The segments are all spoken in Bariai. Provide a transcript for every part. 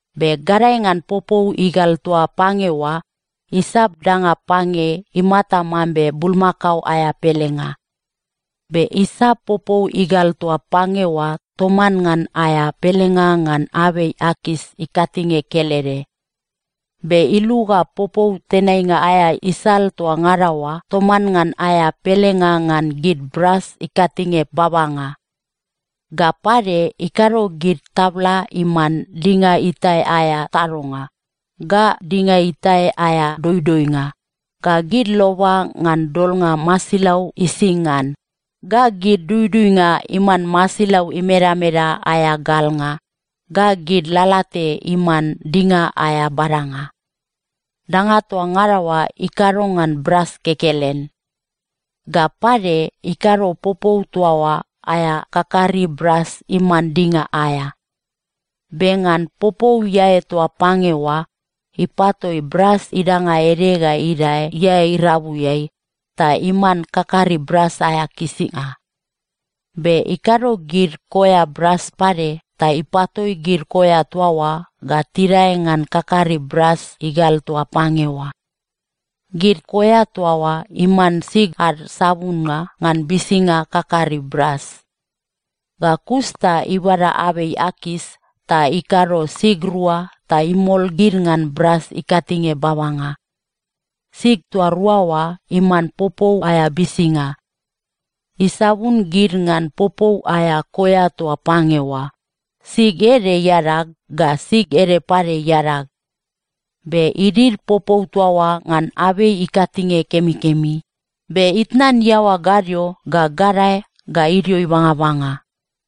Be gadae ngan popou igal toa pange oa, isap danga pange imata mambe bulmakao aea pelenga. Be isap popou igal toa pange oa toman ngan aea pelenga ngan abei akas ikatinge kelede. Be iluga popou tenainga aea isal toa ngada oa toman ngan aea pelenga ngan gid bras ikatinge babanga. Ga pade, ikado gid tabla iman dinga itae aea tadonga, ga dinga itae aea doidoinga, ga gid loba ngan dolnga masilau ising ngan, ga gid duduinga iman masilau imedameda aea galnga, ga gid lalate iman dinga aea badanga. Danga toa ngada oa ikado ngan bras kekelen. Ga pade, ikado popou toa oa aea kakari bras iman dinga aea. Be ngan popou iae toa pange oa, ipatoi bras idanga ede ga idae iae irabuiai, ta iman kakari bras aea kisinga. Be ikado gid koea bras pade ta ipatoi gid koea toa oa ga tidae ngan kakari bras igal toa pange oa. Gid koea toa oa iman sig ad sabunnga ngan bisinga kakari bras. Ga kus ta ibada abei akas, ta ikado sig rua ta imol gid ngan bras ikatinge babanga. Sig toa rua oa iman popou aea bisinga. Isabun gid ngan popou aea koea toa pange oa, sig ede iadag, ga sig ede pade iadag. Be idid popou toa oa ngan abei ikatinge kemikemi, be itnan iaoa gadio ga gadae ga idio ibangabanga.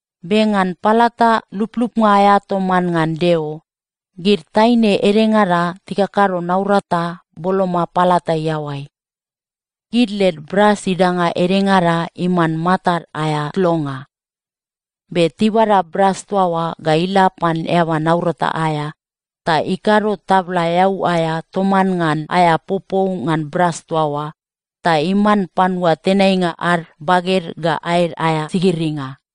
Be ngan palata luplupnga aea toman ngan Deo, gid taine edengada tikakado naurata boloma palata iaoai. Gid led bras idanga edengada iman matad aea tlonga. Be tibada bras toa oa ga ila pan eaba naurata aea, ta ikado tabla eau aea toman ngan aea popou ngan bras toa oa, ta iman panua tenainga ad baged ga aed aea sigiringa.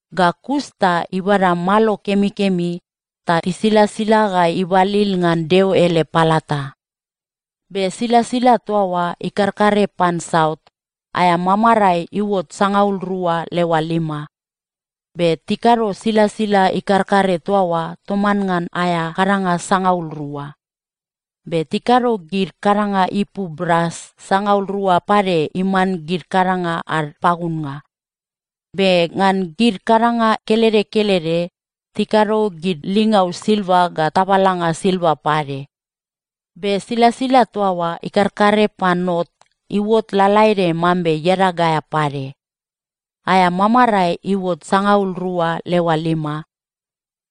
Ga kus ta ibada malo kemikemi ta tisilasila ga ibalil ngan Deo ele palata. Be silasila toa oa ikarkare pan saut, aea mamarae iuot sangaul rua leoa lima. Be tikado silasila ikarkare toa oa toman ngan aea kadanga sangaul rua. Be tikado gid kadanga ipu bras sangaul rua pade iman gid kadanga ad pagunnga. Be ngan gid kadanga kelede kelede, tikado gid lingau silva ga tabalanga silva pade. Be silasila toa oa ikarkare pan not iuot lalaede mambe iadag aea pade. Aea mamarae iuot sangaul rua leoa lima.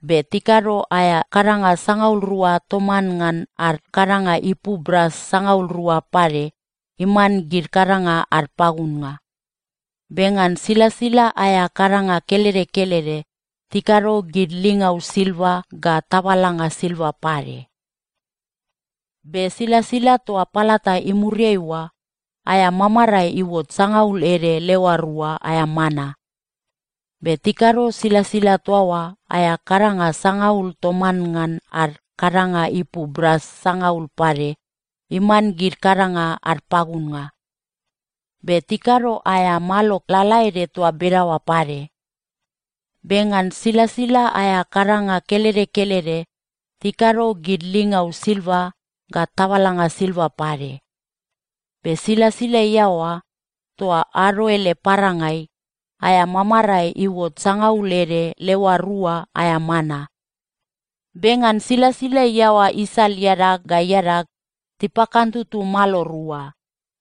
Be tikado aea kadanga sangaul rua toman ngan ad kadanga ipu bras sangaul rua pade iman gid kadanga ad pagunnga. Be ngan silasila aea kadanga kelede kelede, tikado gid lingau silva ga tabalanga silva pade. Be silasila toa palata imuriai oa, aea mamarae iuot sangaul ede leoa rua aea mana. Be tikado silasila toa oa aea kadanga sangaul toman ngan ad kadanga ipu bras sangaul pade iman gid kadanga ad pagunnga. Be tikado aea malo lalaede toa bedaoa pade. Be ngan silasila aea kadanga kelede kelede, tikado gid lingau silva ga tabalanga silva pade. Be silasila iaoa, toa ado ele parangai, aea mamarae iuot sangaul ede leoa rua aea mana. Be ngan silasila iaoa isal iadag ga iadag, tipakantutu malo rua,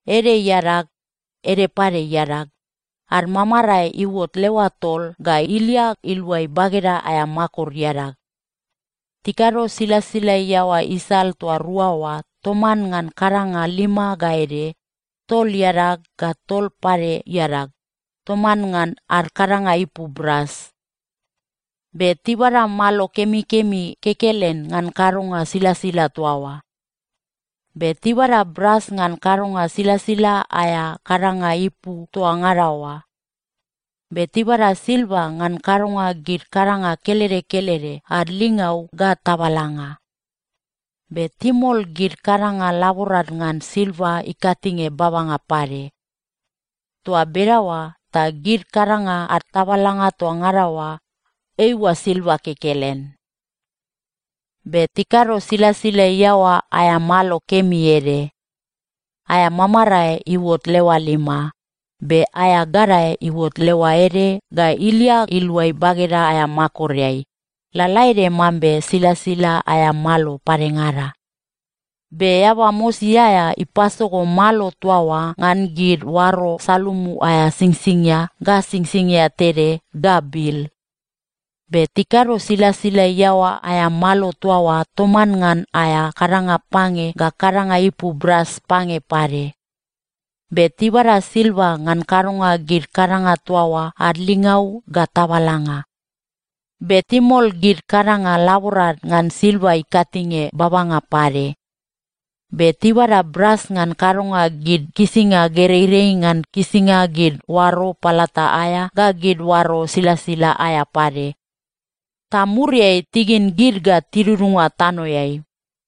ede iadag, ede pade iadag, ad mamarae iuot leoa tol ga ilia iluai bageda aea makor iadag. Tikado silasila iaoa isal toa rua oa toman ngan kadanga lima ga ede, tol iadag, ga tol pade iadag, toman ngan ad kadanga ipu bras. Be tibada malo kemikemi kekelen ngan kadonga silasila toa oa. Be tibada bras ngan kadonga silasila aea kadanga ipu toa ngada oa. Be tibada silva ngan kadonga gid kadanga kelede kelede ad lingau ga tabalanga. Be timol gid kadanga laborad ngan silva ikatinge babanga pade. Toa bedaoa ta gid kadanga ad tabalanga toa ngada oa, eiua silva kekelen. Be tikado silasila iaoa aea malo kemi ede. Aea mamarae iuot leoa lima. Be aea gadae iuot leoa ede ga ilia iluai bageda aea makoreai, lalaede mambe silasila aea malo padengada. Be eaba mosi aea ipasogo malo toa oa ngan gid oaro salumu aea singsingia ga singsingia tede ga bil. Be tikado silasila iaoa aea malo toa oa toman ngan aea kadanga pange ga kadanga ipu bras pange pade. Be tibada silva ngan kadonga gid kadanga toa oa ad lingau ga tabalanga. Be timol gid kadanga laborad ngan silva ikatinge babanga pade. Be tibada bras ngan kadonga gid kisinga gereirei ngan kisinga gid oaro palata aea ga gid oaro silasila aea pade, ta muriai tigin gid ga tidudunga tanoeai.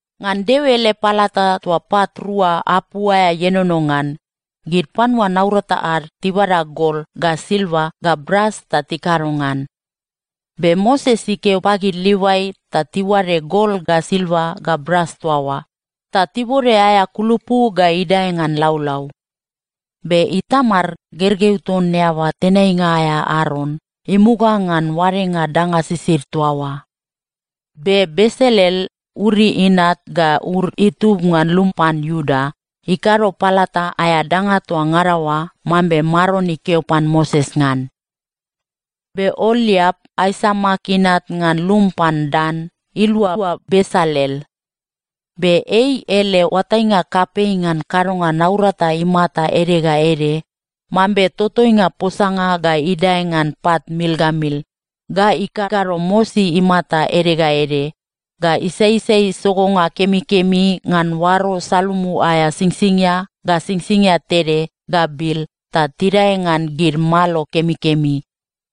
Ngan Deo ele palata toa pat rua apu aea ienono ngan, gid panua naurata ad tibada gol ga silva ga bras ta tikado ngan. Be Moses ikeo pagid Livai ta tiuade gol ga silva ga bras toa oa, ta tibode aea kulupu ga idae ngan laulau. Be Itamar, gergeu ton eaba tenainga aea Aron, imuga ngan oadenga danga sisid toa oa. Be Besalel, Uri inat ga Ur itub ngan lum pan Iuda, ikado palata aea danga toa ngada oa mambe Maron ikeo pan Moses ngan. Be Ooliap, Aisamak inat ngan lum pan Dan, ilualua Besalel. Be ei ele oatainga kapei ngan kadonga naurata imata ede ga ede mambe totoinga posanga ga idae ngan pat mil ga mil, ga ikakado mosi imata ede ga ede, ga isaisai sogonga kemikemi ngan oaro salumu aea singsingia ga singsingia tede ga bil ta tidae ngan gid malo kemikemi.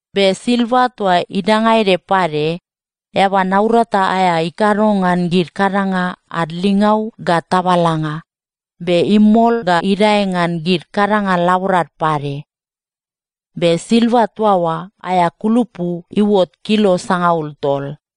Be silva toa idanga ede pade, eaba naurata aea ikado ngan gid kadanga ad lingau ga tabalanga, be imol ga idae ngan gid kadanga laborad pade. Be silva toa oa aea kulupu iuot kilo sangaul tol.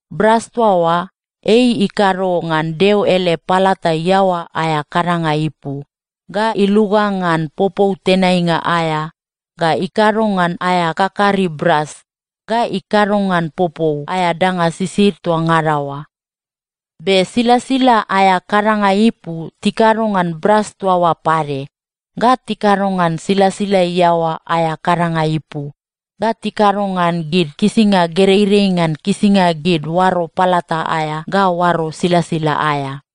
Bras toa oa, ei ikado ngan Deo ele palata iaoa aea kadanga ipu, ga iluga ngan popou tenainga aea, ga ikado ngan aea kakari bras, ga ikado ngan popou aea danga sisid toa ngada oa. Be silasila aea kadanga ipu tikado ngan bras toa oa pade, ga tikado ngan silasila iaoa aea kadanga ipu, ga tikado ngan gid kisinga gereirei ngan kisinga gid oaro palata aea ga oaro silasila aea.